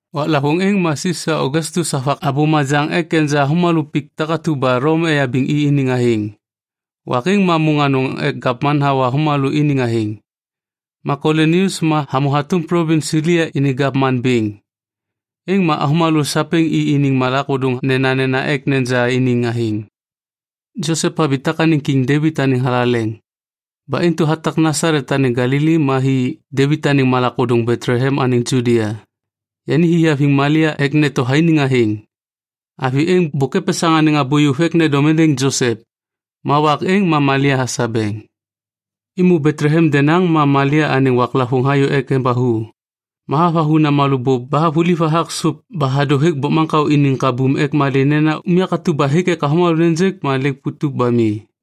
Waklavôŋ êŋ ma Sisa Ogastus havak abô majaŋ ek neja avômalô pik takatu ba Lom eyabiŋ i iniŋ athêŋ. Wak êŋ ma môŋ anôŋ ek gavman hawa avômalô iniŋ athêŋ. Ma Kulinius ma hamô hatôm plovins Silia iniŋ gavman bêŋ. Êŋ ma avômalô sapêŋ i iniŋ malak ôdôŋ nenanena ek neja iniŋ athêŋ. Josep habitak anêŋ Kiŋ Devit anêŋ thalaleŋ. Ba intu hatak Nasalet anêŋ Galili ma hi Devit anêŋ malak ôdôŋ Betlehem anêŋ Judia. Yani hi haviŋ Malia ek neto thainiŋ athêŋ. Avi êŋ bôk epesaŋ anêŋ abô yôv ek nendom êndêŋ Josep. Ma wak êŋ ma Malia hasabeŋ. Êmô Betlehem denaŋ ma Malia anêŋ waklavôŋ hayô ek embathu. Ma havathu namalô bôp ba havuliv hathak sôp ba hadô hêk bokmaŋkao iniŋ kabum ek malê nena unyak atu ba hêk ek avômalô nêjêk ma lêk putup ba mi.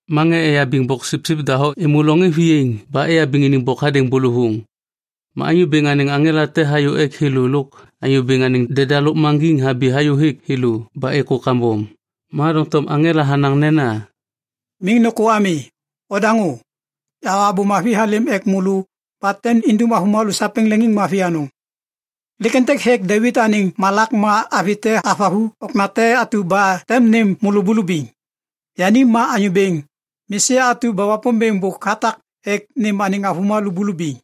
Ma ŋê eyabiŋ boksipsip doho êmô loŋ êŋ viyaiŋ ba eyabiŋ iniŋ bok hadêŋ bôlôvôŋ. Ma Anyô Bêŋ anêŋ aŋela te hayô ek thêlô lôk Anyô Bêŋ anêŋ deda lôkmaŋgiŋ habi hayôhêk thêlô ba êkô kambom. Ma doŋtom aŋela hanaŋ nena, “Miŋ nôkô ami. Odaŋô! Yahawa abô mavi halêm ek môlô ba tem indum avômalô sapêŋ leŋiŋmavi anôŋ. Lêk êntêk hêk Devit anêŋ malak ma avi te havathu okna te atu ba tem nêm môlô bulubiŋ. Yani ma Anyô Bêŋ, Mesia atu ba Wapômbêŋ bôk hatak ek nêm anêŋ avômalô bulubiŋ.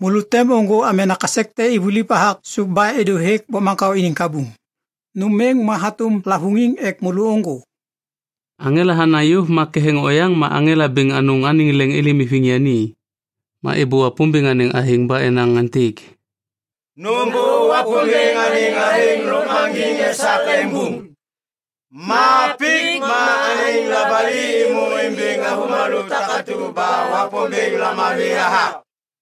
Môlô tem ôŋgô amena kasek te ivuliv hathak sôp ba êdô hêk bokmaŋkao iniŋ kabum. Nôm êŋ ma hatôm lavôŋiŋ ek môlô ôŋgô.” Aŋela hanaŋ yôv ma ketheŋ oyaŋ ma aŋela bêŋ anôŋ anêŋ leŋ êlêm iviŋ yani. Ma êbô Wapômbêŋ anêŋ athêŋ ba enaŋ aêntêk, “Nômbô Wapômbêŋ anêŋ athêŋ lôkmaŋgiŋ esak leŋbum. Ma pik ma anêŋ labali êmô imbiŋ avômalô takatu ba Wapômbêŋ lamavi hathak.”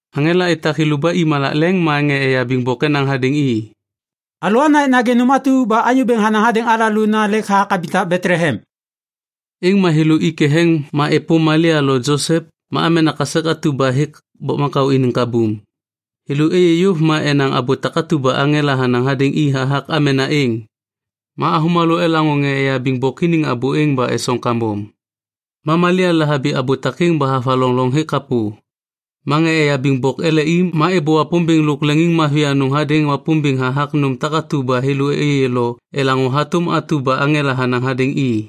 Aŋela etak thêlô ba i malak leŋ ma ŋê eyabiŋ bok enaŋ hadêŋ i, “Alôana ek nagê nôm atu ba Anyô Bêŋ hanaŋ hadêŋ alalô nena lêk habitak Betlehem.” Êŋ ma thêlô i ketheŋ ma êpôm Malia lo Josep ma amena kasek atu ba hêk bokmaŋkao iniŋ kabum. Thêlô êyê yôv ma enaŋ abô takatu ba aŋela hanaŋ hadêŋ i hathak amena êŋ. Ma avômalô elaŋô ŋê eyabiŋ bok iniŋ abô êŋ ba esoŋ kambom. Ma Malia lahabi abô takêŋ ba havaloŋ loŋ hêk kapô. Ma ŋê eyabiŋ boksipsip ele i ma êbô Wapômbêŋ lôk leŋiŋmavi anôŋ hadêŋ Wapômbêŋ hathak nôm takatu ba thêlô êyê lo elaŋô hatôm atu ba aŋela hanaŋ hadêŋ i.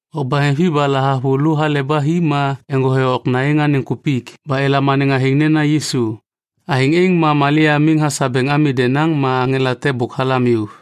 Wak baheŋvi ba lahavulô hale ba hi ma eŋgothe okna êŋ anêŋ kupik ba elam anêŋ athêŋ nena Yisu. Athêŋ êŋ ma Malia miŋ hasabeŋ ami denaŋ ma aŋela te bôk halam yôv.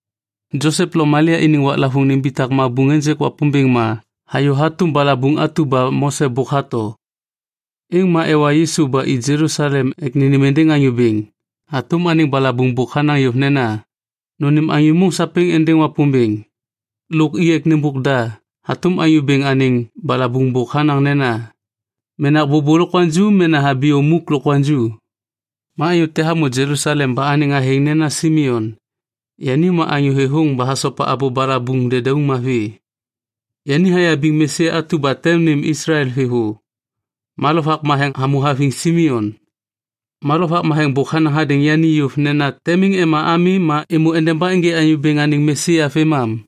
Josep lo Malia iniŋ waklavôŋ nimbitak mabuŋ ênjêk Wapômbêŋ ma hayô hatôm balabuŋ atu ba Mose bôk hato. Êŋ ma ewa Yisu ba i Jelusalem ek nênêm êndêŋ Anyô Bêŋ hatôm anêŋ balabuŋ bôk hanaŋ yôv nena, “Nônêm anyô môŋ sapêŋ êndêŋ Wapômbêŋ.” Lôk i ek nêmbôk da hatôm Anyô Bêŋ anêŋ balabuŋ bôk hanaŋ nena, “menak bôbô lokwaŋju mena thabiyom muk lokwaŋju.” Ma anyô te hamô Jelusalem ba anêŋ athêŋ nena Simeon. Yani ma anyô thêthôŋ ba hasopa abô balabuŋ dedauŋ mavi. Yani hayabiŋ Mesia atu ba tem nêm Islael thêvô. Ma Lovak Matheŋ hamô haviŋ Simeon. Ma Lovak Matheŋ bôk hanaŋ hadêŋ yani yôv nena tem miŋ ema ami ma êmô endeba ênjê Anyô Bêŋ anêŋ Mesia vêmam.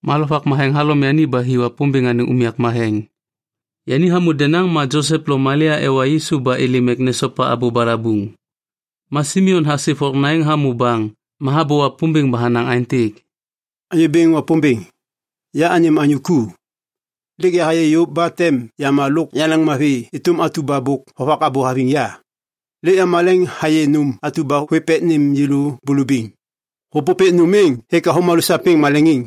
Ma Lovak Matheŋ halom yani ba hi Wapômbêŋ anêŋ unyak matheŋ. Yani hamô denaŋ ma Josep lo Malia ewa Yisu ba êlêm ek nesopa abô balabuŋ. Ma Simeon hasip okna hamô baŋ ma habô Wapômbêŋ ba hanaŋ aêntêk, “Anyô Bêŋ Wapômbêŋ, ya anêm anyô ku. Lêk yahayê yôv ba tem yama lôk yaleŋmavi êtôm atu ba bôk hovak abô haviŋ ya. Lêk yamaleŋ hayê nôm atu ba hôêv ek nêm yêlô bulubiŋ. Hôpôpêk nôm êŋ hêk avômalô sapêŋ maleŋiŋ.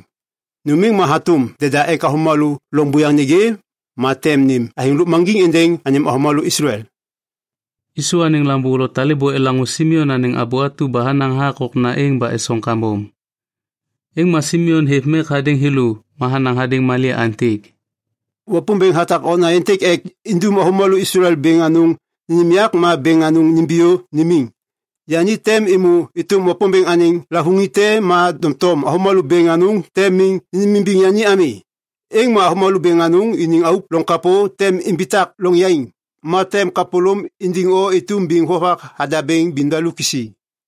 Nôm êŋ ma hatôm deda ek avômalô loŋ buyaŋ nêgê, ma tem nêm athêŋ lôkmaŋgiŋ êndêŋ anêm avômalô Islael.” Yisu anêŋ lambô lo talêbô elaŋô Simeon anêŋ abô atu ba hanaŋ hathak okna êŋ ba esoŋ kambom. Êŋ ma Simeon hêv mek hadêŋ thêlô ma hanaŋ hadêŋ Malia aêntêk, “Wapômbêŋ hatak okna êntêk ek indum avômalô Islael bêŋ anôŋ nênêm yak ma bêŋ anôŋ nimbiyô nimiŋ. Yani tem êmô êtôm Wapômbêŋ anêŋ lavôŋiŋ te ma doŋtom avômalô bêŋ anôŋ tem miŋ nênêmimbiŋ yani ami. Êŋ ma avômalô bêŋ anôŋ iniŋ auk loŋ kapô tem imbitak loŋ yaiŋ. Ma tem kapôlôm indiŋ o êtôm biŋ vovak hadabêŋ bimdaluk kisi.”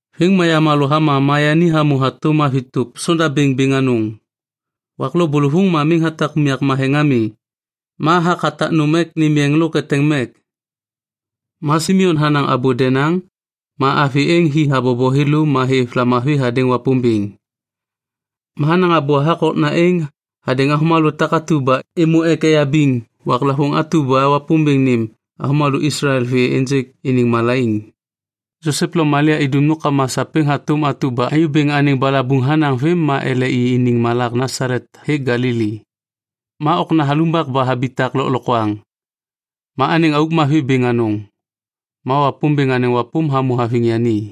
Vêm ma yamalô hama ma yani hamô hatôm avi tôp sondabêŋ bêŋ anôŋ. Wak lo bôlôvôŋ ma miŋ hatak unyak matheŋ ami, ma hathak hatak nôm ek nêm yeŋ lo eteŋ mek. Ma Simeon hanaŋ abô denaŋ, ma avi êŋ hi habobo thêlô ma hêv lamavi hadêŋ Wapômbêŋ. Ma hanaŋ abô hathak okna êŋ hadêŋ avômalô takatu ba êmô ek eyabiŋ waklavôŋ atu ba Wapômbêŋ nêm avômalô Islael vê ênjêk iniŋ malaiŋ. Josep lo Malia idum nômkama sapêŋ hatôm atu ba Anyô Bêŋ anêŋ balabuŋ hanaŋ vêm ma ele i iniŋ malak Nasalet hêk Galili. Ma okna halumbak ba habitak lôklokwaŋ. Ma anêŋ auk mavi bêŋ anôŋ. Ma Wapômbêŋ anêŋ wapôm hamô haviŋ yani.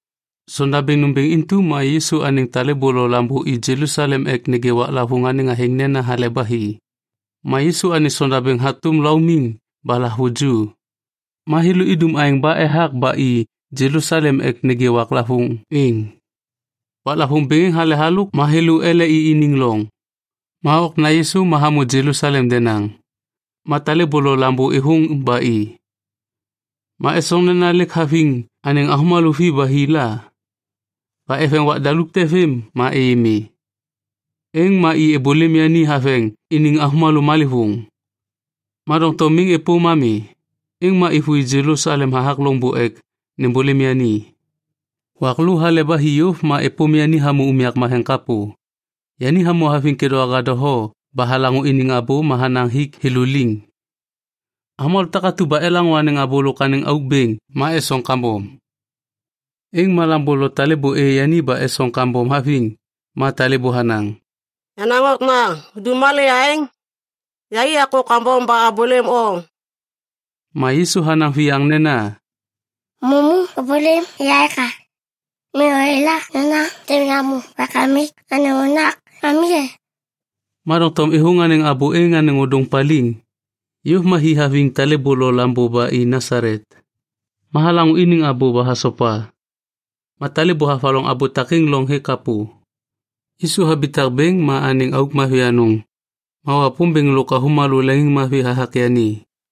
Sondabêŋ nômbêŋ intu ma Yisu anêŋ talêbô lo lambô i Jelusalem ek nêgê waklavôŋ anêŋ athêŋ nena Hale ba Hi. Ma Yisu anêŋ sondabêŋ hatôm laumiŋ ba lahavuju, ma thêlô idum aêŋ ba ethak ba i Jelusalem ek nêgê waklavôŋ êŋ. Waklavôŋ bêŋ êŋ hale halôk ma thêlô ele i iniŋ loŋ. Ma okna Yisu ma hamô Jelusalem denaŋ. Ma talêbô lo lambô êthôŋ ba i. Ma esoŋ nena lêk haviŋ anêŋ avômalô vi ba hi la. Ba eveŋ wak daluk te vêm ma êyê mi, êŋ ma i êbôlêm yani haveŋ iniŋ avômalô malêvôŋ. Ma doŋtom miŋ êpôm ami, êŋ ma êvôi Jelusalem hathak loŋbô ek nêmbôlêm yani. Wak lô hale ba hi yôv ma êpôm yani hamô unyak matheŋ kapô. Yani hamô haviŋ kêdôŋwaga doho ba halaŋô iniŋ abô ma hanaŋ hik thêlô liŋ. Avômalô takatu ba elaŋô anêŋ abô lôk anêŋ auk bêŋ ma esoŋ kambom. Êŋ ma lambô lo talêbô êyê yani ba esoŋ kambom haviŋ. Ma talêbô hanaŋ, “Yenaŋ okna, hudum malê aêŋ? Yai akô kambom ba abôlêm o.” Ma Yisu hanaŋ viyaŋ nena, “Mamu ôbôlêm ya eka? Miŋ oyala nena tem yamô Wakamik anêŋ unyak ami e?” Ma doŋtom êthôŋ anêŋ abô êŋ anêŋ ôdôŋ paliŋ. Yôv ma hi haviŋ talêbô lo lambô ba i Nasalet. Ma halaŋô iniŋ abô ba hasopa. Ma talêbô havaloŋ abô takêŋ loŋ hêk kapô. Yisu habitak bêŋ ma anêŋ auk mavi anôŋ. Ma Wapômbêŋ lôk avômalô leŋiŋmavi hathak yani.